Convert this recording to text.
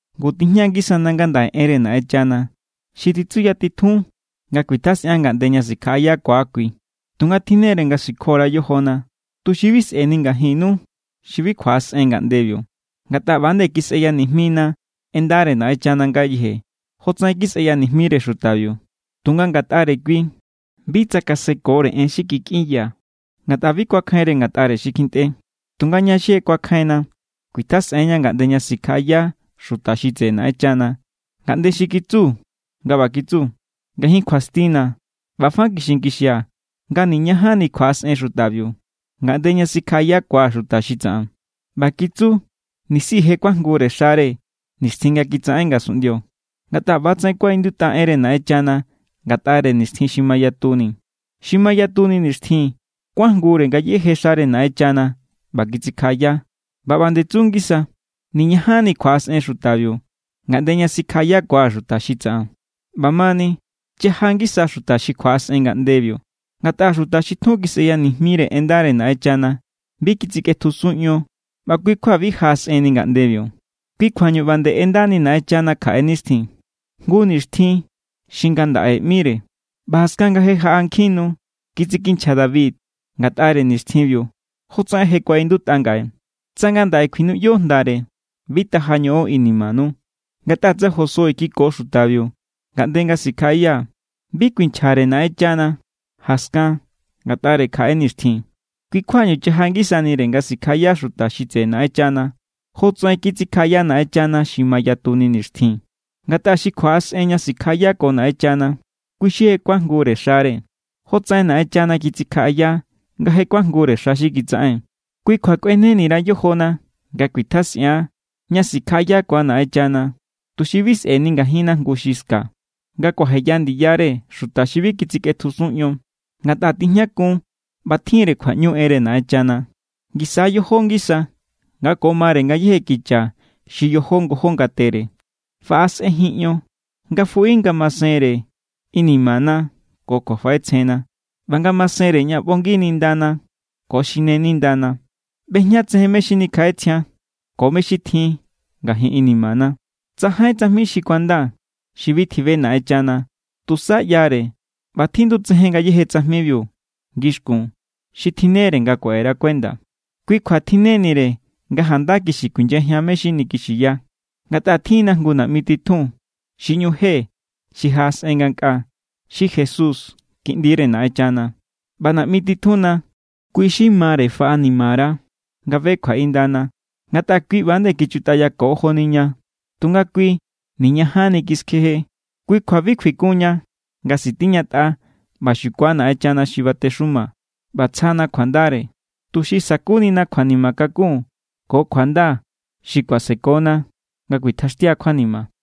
Ngu, tijña=ngisa ngandaꞌe enre Naꞌenchana xi titsuyatitjun nga kuitjasꞌian ngaꞌnde ña sikjaꞌayakua kui. Tunga tjinnere nga sikjo_ra yojona, tuxi bi sꞌe̱ni ngajinnu xi bi kjuaꞌasꞌen ngaꞌndebiu. Ngatꞌa ꞌba=nde kisꞌeya nijmina en ndare Naꞌenchana ngayeje, jotsaꞌen kisꞌeya nijmire xutabiu. Tunga ngatꞌare kui, bi tsakaseko en xi kikꞌinya, ngatꞌa bi kuakjainre ngatꞌare xi kjintꞌe. Tunga ña xi je kuakjainna kuitjasꞌen=ña ngaꞌnde ña sikjaꞌaya xuta xi tseꞌe Naꞌenchana, ngaꞌnde xi kitsu nga ꞌba kitsu: Ngajin kjuastina̱ ꞌba fa kixinkixia̱, nga niñajanni kjuaꞌasꞌen xutabiu, ngaꞌnde ña sikjaꞌayakua̱ xuta xi tsaꞌan. ꞌBa kitsu, nisi je kuajngure xare nixtjin nga kitsaꞌen ngasunꞌndio. Ngatꞌa ꞌbatsaꞌen kuaꞌindutꞌa enre Naꞌenchana ngatꞌare nixtjin xi mayatuni: Xi mayatuni nixtjin kuajngure ngayéje xare Naꞌenchana ꞌba kitsikjaꞌaya. ꞌBa ꞌba=nde tsu ngisa: Niñajanni kjuaꞌasꞌen xutabiu, ngaꞌnde ña sikjaꞌayakua̱ xuta xi tsaꞌan. ꞌBamani, chaja ngisa xuta xi kjuaꞌasꞌen ngaꞌndebiu. Ngatꞌa xuta xi tjun kisꞌeya nijmire en ndare Naꞌenchana, bi kitsikꞌetjusun ion ꞌba kui= kjua bi jaꞌasꞌenni ngaꞌndebiu. Kui kjuañu ꞌba nde ꞌendani Naꞌenchana kjaꞌe nixtjin, jngu nixtjin xi “ngandaꞌe” ꞌmire. ꞌBa jaskan nga je jaꞌa nkjin nu, kitsikinchja David ngatꞌare nixtjinbiu, jotsaꞌen je kuaꞌindutꞌa ngaꞌe: Tsa ngandaꞌe kjuinuꞌyo jndare, bi taja ñoꞌon inimanu. Ngatꞌa tsa Josué kiko xutabiu ngaꞌnde nga sikjaꞌaya, bi kuinchjare Naꞌenchana jaskan ngatꞌare kjaꞌe nixtjin. Kui= kjuañu chaja ngisanire nga sikjaꞌaya xuta xi tseꞌe Naꞌenchana, jotsaꞌen kitsikjaꞌaya Naꞌenchana xi mayatuni nixtjin. Ngatꞌa xi kjuaꞌasꞌen ña sikjaꞌayako Naꞌenchana, kui xi je kuajngure xare, jotsaꞌen Naꞌenchana kitsikjaꞌaya nga je kuajngure xa xi kitsaꞌen. Kui kjua kꞌueneni_ra yojona nga kuitjasꞌian ña sikjaꞌayakua Naꞌenchana, tuxi bi sꞌe̱ni ngajinna jngu xi ska, nga kuajeya ndiyare xuta xi bi kitsikꞌetjusun ion. Ngatꞌa tijñakun ꞌba tjin=re kjuaꞌñu enre Naꞌenchana. Ngisa yojó ngisa nga ko mare ngayéje kicha xi yojó ngojó ngatere. Faꞌasꞌenjin ion nga fuꞌi ngamasenre inimana ko kjuafaꞌetsjenna, ꞌba ngamasenre ña ꞌbongi nindana ko xine nindana. ꞌBejñatsejen mé= xi nikjaꞌetsjian ko mé= xi tjin ngajin inimana. Tsajain tsajmi xi kuanda xi bi tjibe Naꞌenchana. Tusa ꞌyare ꞌba tjindu tsejen ngayéje tsajmibiu ngixkun xi tjinnere nga kuaꞌera kuenda. Kui kjua tjinnenire nga janda kixi kuinyajian mé= xi nikixiya. Ngatꞌa tjin=na jngu naꞌmi titjun xi ꞌñu je xi jaꞌasꞌen ngankꞌaa, xi Jesús Kiꞌndire Naꞌenchana. ꞌBa naꞌmi titjunna, kui= xi mare faꞌanimara nga be kjuaꞌindana. Ngatꞌa kui ꞌba=nde kichutꞌayako joni ña, tunga kui niñajanni kiskjeje. Kui kjua bi kjuikunniña nga sitiñatꞌa ꞌba xukua Naꞌenchana xi batexumana ꞌba tsjana kjuandare, tuxi sa̱kunina kjuanima kakun ko kjuanda xi kuasekona nga kuitjaxtia kjuanima.